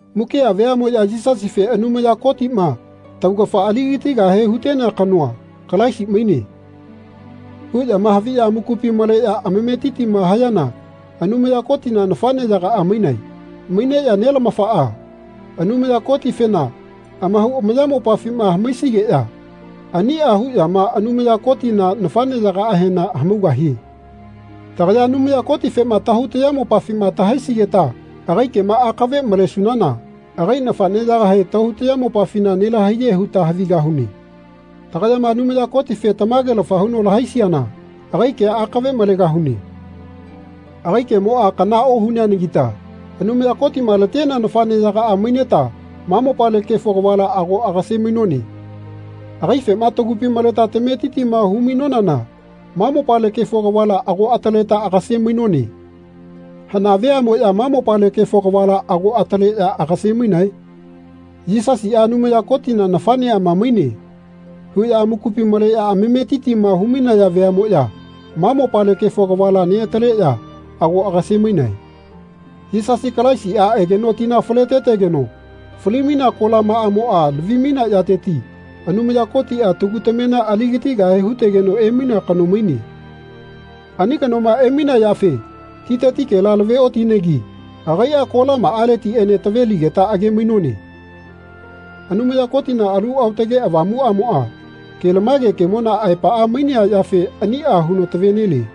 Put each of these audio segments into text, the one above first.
Mukia veamoya Yisasife Anumaya Kotima taugafa aligatigahe hutenea kanoa, Kalaisi maine. huyama haviya amakupi maleya amametitima hayana Anumaya Kotina nafaneyagaa mainae. Maineya Nelamafaa, Anumaya Kotifena, amahau amayamopafima hamaisigeya ania huyama Anumaya Kotina nafaneyagaahena hamaugahie. Tagaya Anumaya Kotifema tahau tayamopafima tahaisigeta agai kema akave malesunana agai nafaneyagahe tahau tayamopafina nelahaiye huta havigahune. Tagayama Anumaya Kotife tamagelafa huno lahaisiana agai kea akave malegahune. Agai kemoa kana ohuneanagita Anumaya Kotima latenea nafaneyagaa maineta ma mopale kefo kavala ago agase-mainone. Agaifema tagupi maleta tametitima hu-mainonana ma mopale kefo kavala ago ataleta agase-mainone. Hana veamoya ma mopale kefo kavala ago ataleya agase-mainae? Yisasia Anumaya Kotina nafaneama maine. huya amakupi maleya amametitima hu-mainaya veamoya ma mopale kefo kavala neataleya ago agase-mainae. Yisasi Kalaisia egeno tina faletetegeno fali-mainea kolamaamoa lavi-mainea yateti Anumaya Kotia tagu tamena aligatigahe hutegeno emainea kano maine. Ani kanoma emainea yafe titetikela lave-otinegi agaia kolamaaletiene taveligeta age-mainone. Anumaya Kotina Alu Aotake Avamuamoa kelamage kemona aepaa mainea yafe ania huno tave-nelie.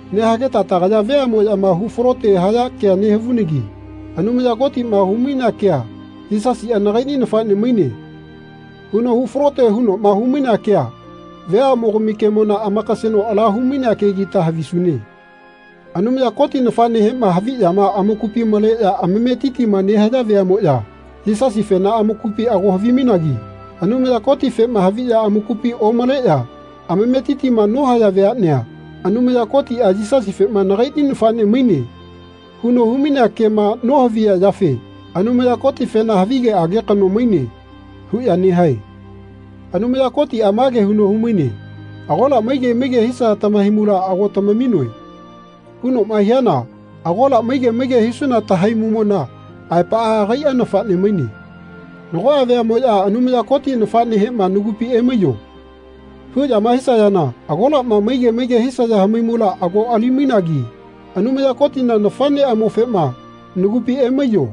Nehageta tagaya veamoyama hu falote haya kea nehavunanagi Anumaya Kotima hu-mainea kea Yisasia nagaini nafane maine. huno hu falote hunoma humainea kea veamogami kemona amakaseno ala humainea kegita havisune. Anumaya Koti nafanehema haviyama amakupi maleya amametitima nehaya veamoya Yisasifena amakupi ago havimainagi Anumaya Kotifema haviya amakupi omaleya amametitima nohaya veanea Anumaya Kotia Yisasifema nagaini nafane maine. huno hu-mainea kema nohaviya yafe Anumaya Kotifena Havigeage kano maine. huya nehae. Anumaya Kotia mage huno humaine Agola maige maige hisaya tamahaimula ago tamaminoe. hunoma hiana agola maige maige hisuna tahaimumona aepaa agaia nafane maine. Nagoa veamoya Anumaya Kotina nafanehema Nagupi emaiyo. huyama hisayana agolama maige maige hisaya hamaimula ago ali-mainagi Anumaya Kotina nafaneamofema Nagupi emaiyo.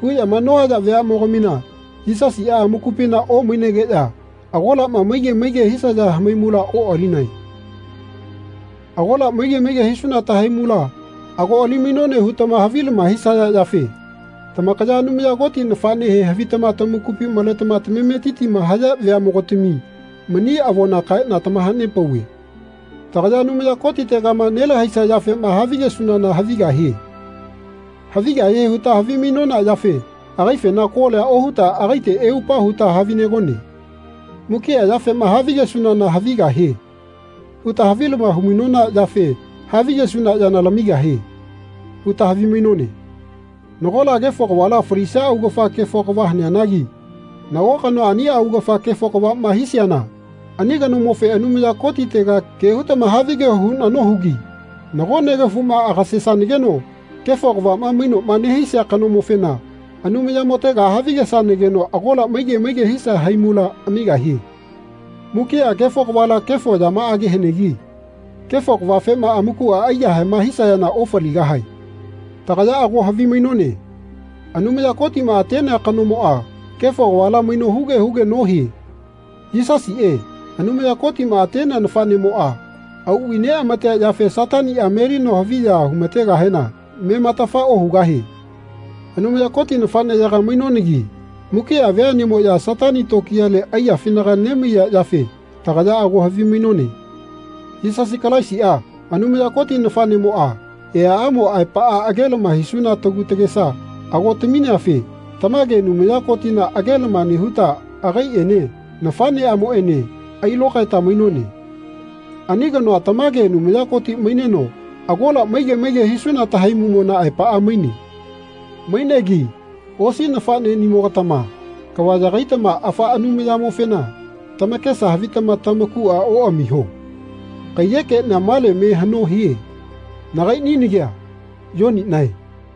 huyama nohaya veamogamina Yisasia amakupina omainegeya agolama maige maige hisaya hamaimula oalinae. Agola maige maige hisuna tahaimula ago ali-mainone hutama havilama hisaya yafe tamakaya Anumaya Koti nafanehe havitama tamakupi maletama tamametitima haya veamogatami mani avona kaena tamahanepauve. Tagaya Anumaya Kotitegama nelahaisia yafema havigesunana havigahie. Havigahie huta havimainona yafe agaifena kolia ohuta agaite eupa huta havinegone. Mukia yafema havigesunana havigahie. huta havilama hu-mainona yafe Havigesuna yana lamigahie. huta havimainone. Nagola kefo kavala falisia augafa kefo kava haneanagi nago kanoa ania augafa kefo kavama hiseana ani kanomofe Anumaya Kotitega ke hutama havigeho huna nohugi nago negafuma agesanageno kefo kavama mainoma nehisia kanomofena Anumayamotega havigesanageno agola maige maige hisia haimula amigahie. Mukia kefo kavala kefo yamaage hanegi kefo kavafema amakua aiyahaema hisayana ofaligahae. Tagaya ago havimainone Anumaya Kotima atenea kanomoa kefo kavala maino huge huge nohie. Yisasie, Anumaya Kotima atenea nafanemoa, auvai neamatea yafe Satania melino haviya humategahena mematafa ohugahie. Anumaya Koti nafaneyaga mainonagi mukia veanemoya Satani tokiyale aiyafinaga nemaiya yafe tagaya ago havimainone. Yisasi Kalaisia, Anumaya Koti nafanemoa, eaamo aepaa agelama hisuna tagu tagesa ago tamineafe tamage Anumaya Kotina agelama nehuta agaiene nafaneamoene ailokaeta mainone. Ani kanoa tamage Anumaya Koti maineno agola maige maige hisuna tahaimumona aepaa maine. Mainegi osi nafaneyaganimogatama kava yagaitama afaa Anumayamofena tamakesa havitama tamakua oamiho. Kaiyekenia male me hano hie. Nagainia nagia Yoninae.